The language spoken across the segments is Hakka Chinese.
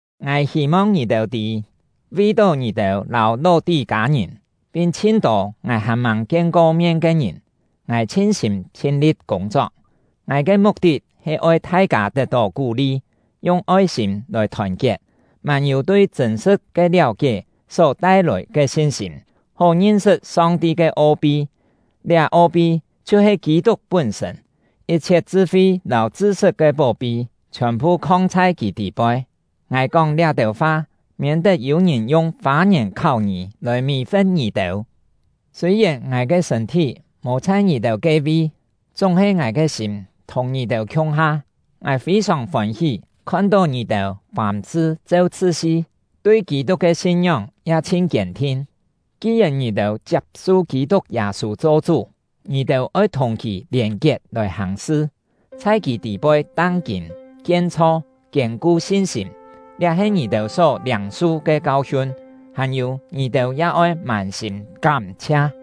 Ngài hî-mong ngì-têu tî, vi-tó ngì-têu lâu Ló-tí-kâ-ngìn, pin chhin-tô ngài hàn-màng kien-ko mien ke ngìn, ngài chhin-sîm chhin-li̍t kûng-chok. Ngài ke muk-tit he oi thai-kâ tet-tó kú-li, yung oi-sîm lòi thòn-kiet, mân-yû tui chṳ̂n-sṳ̍t ke liáu-kié só tai-lòi ke sin-sîm, hó ngin-sṳt Song-ti ke o-pi; liá o-pi chhiu-he Kî-tuk pún-sṳ̂n. Yit-chhiet chṳ-fi lâu chṳ-sṳt ke pó-pi chhiòn-phu khong chhai kì tî-poi. Ngài kóng liá-têu fa, miên-tet yû-ngìn yung fâ-ngièn kháu-ngî lòi mì-fe̍t ngì-têu. Sûi-yèn ngài ke sṳ̂n-thí mò chhai ngì-têu ke-vi, chúng-he ngài ke sîm thùng ngì-têu khiung-ha. Ngài fî-sòng fôn-hí khon-tó ngì-têu fàm-sṳ cheu chṳt-si, tui Kî-tuk ke sin-ngióng ya chhin kiên-thin. Ki-yèn ngì-têu chiap-su Kî-tuk Yâ-sû cho Chú, ngì-têu oi thùng kì lièn-kiet lòi hàng sṳ, chhai kì tî-poi tang-kîn, kien-chho, kiên-ku sin-sîm; liá he ngì-têu só liâng-su ke kau-hiun. Hàn-yû, ngì-têu ya oi mân-sîm kám-chhia!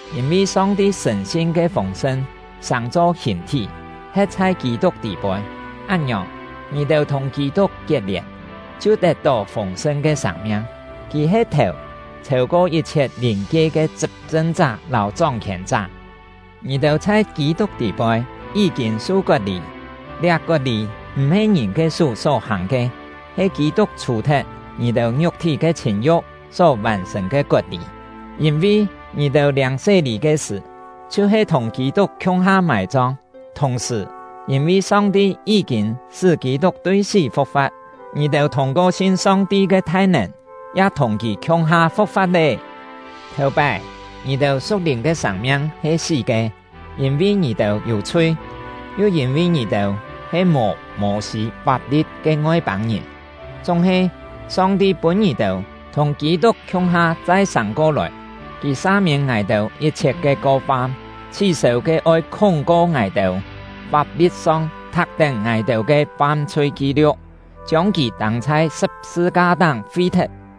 Yîn-vi Song-ti sṳ̀n-sin ke fûng-sṳn sàng-cho hìn-thí he̍t chhai Kî-tuk tî-poi, án-ngiòng, ngì-têu thùng Kî-tuk kiet-lièn chhiu tet-tó fûng-sṳn ke sâng-miang. Kì he thèu, chhêu-ko yit-chhiet lìn-kie ke chṳp-chṳn-chá lâu chóng-khièn-chá. Ngì-têu chhai Kî-tuk tî-poi yí-kîn su kot-lî; liá kot-lî m̀-he ngìn ke sú só-hàng ke, he Kî-tuk chhù-thet ngì-têu ngiuk-thí ke chhìn-yu̍k só vàn-sṳ̀n ke kot-lî. Yîn-vi, ngì-têu liâng sé-lî ke sṳ̀, chhiu-he thùng Kî-tuk khiung-ha mài-chong; thùng-sṳ̀, yîn-vi Song-ti yí-kîn sṳ́ Kî-tuk tui sí fu̍k-fa̍t, ngì-têu thûng-ko sin Song-ti ke thai-nèn ya thùng kì khiung-ha fu̍k-fa̍t lé. Thèu-pái, ngì-têu su̍k-lìn ke sâng-miang he sí ke, yîn-vi ngì-têu yû chhui, yu yîn-vi ngì-têu he mò Mô-sî fap-li̍t ke Ngoi-pâng-ngìn. Chúng-he, Song-ti pûn ngì-têu thùng Kî-tuk khiung-ha chai sâng-ko-lòi. Kì sa-miên ngài-têu yit-chhiet ke ko-fam, chhí-sêu ke oi khúng-ko ngài-têu, fap-li̍t-song thak-tén ngài-têu ke fam-chhui ki-liu̍k, chiông kì tâng chhai sṳ̍p-sṳ-ka-táng fi-thet.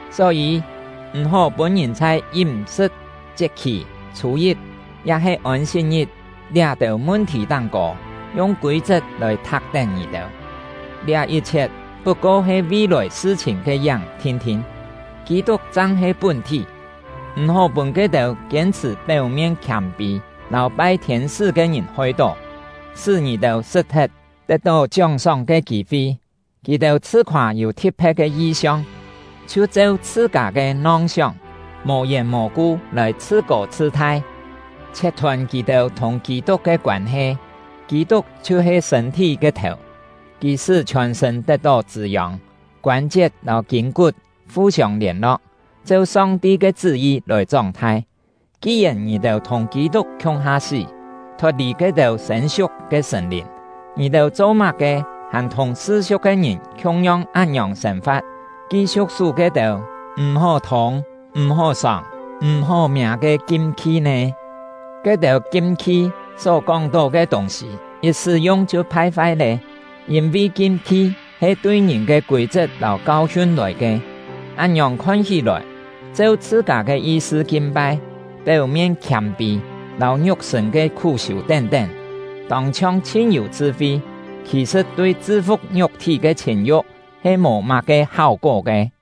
Só-yî, m̀-hó pûn ngìn chhai yím-sṳ̍t, chiet-khì, chhû-yit, ya-he Ôn-sit-ngit liá-têu mun-thì táng-kô yung kûi-chet lòi thak-tén ngì-têu. Liá yit-chhiet put-ko he vi-lòi sṳ-chhìn ke yáng thin-thin; Kî-tuk chang he pún-thí. M̀-hó pûn ke-têu kiên-chhṳ̀ péu-mien khiâm-pî lâu pai thiên-sṳ́ ke ngìn hoi-tó, sṳ́ ngì-têu sṳt-thet tet-tó chióng-sóng ke kî-fi. Kì-têu chhṳ-khoâ yû thi̍t-phe̍t ke yi-siong, chhiu cheu chhṳ-kâ ke nong-sióng, mò-yèn mò-ku lòi chhṳ-kô chhṳ-thai, chhiet-thôn kì-têu thùng Kî-tuk ke koân-he. Kî-tuk chhiu-he sṳ̂n-thí ke thèu; kì sṳ́ chhiòn-sṳ̂n tet-tó chṳ̂-yông, koân-chiet lâu kîn-kut fu-siông lièn-lo̍k, cheu Song-ti ke chṳ́-yi lòi chóng-thai. Ki-yèn ngì-têu thùng Kî-tuk khiung-ha sí, thot-lì ke-têu sên-siuk ke sṳ̀n-lìn, ngì-têu cho-má-ke hàn thùng sṳ-siu̍k ke ngìn khiung-yong án-ngiòng sên-fa̍t, ki-siu̍k sú ke-têu “M̀-hó thûng, m̀-hó sòng, m̀-hó miâ” ke kim-khi nè? Ke-têu kim-khi só kóng-tó ke tûng-sî yit sṳ́-yung chhiu phai-fai lé; yîn-vi kim-khi he tui ngìn ke kûi-chet lâu kau-hiun lòi ke. Án-ngiòng khon hí-lòi, cheu chhṳ-kâ ke yi-sṳ kin-pai, péu-mien khiâm-pî, lâu ngiuk-sṳ̂n ke khú-siû tén-tén, tông-chhiong chhin-yû chṳ-fi; khì-sṳ̍t, tui chṳ-fu̍k ngiuk-thí ke chhìn-yu̍k he mò má-ke háu-kó ke.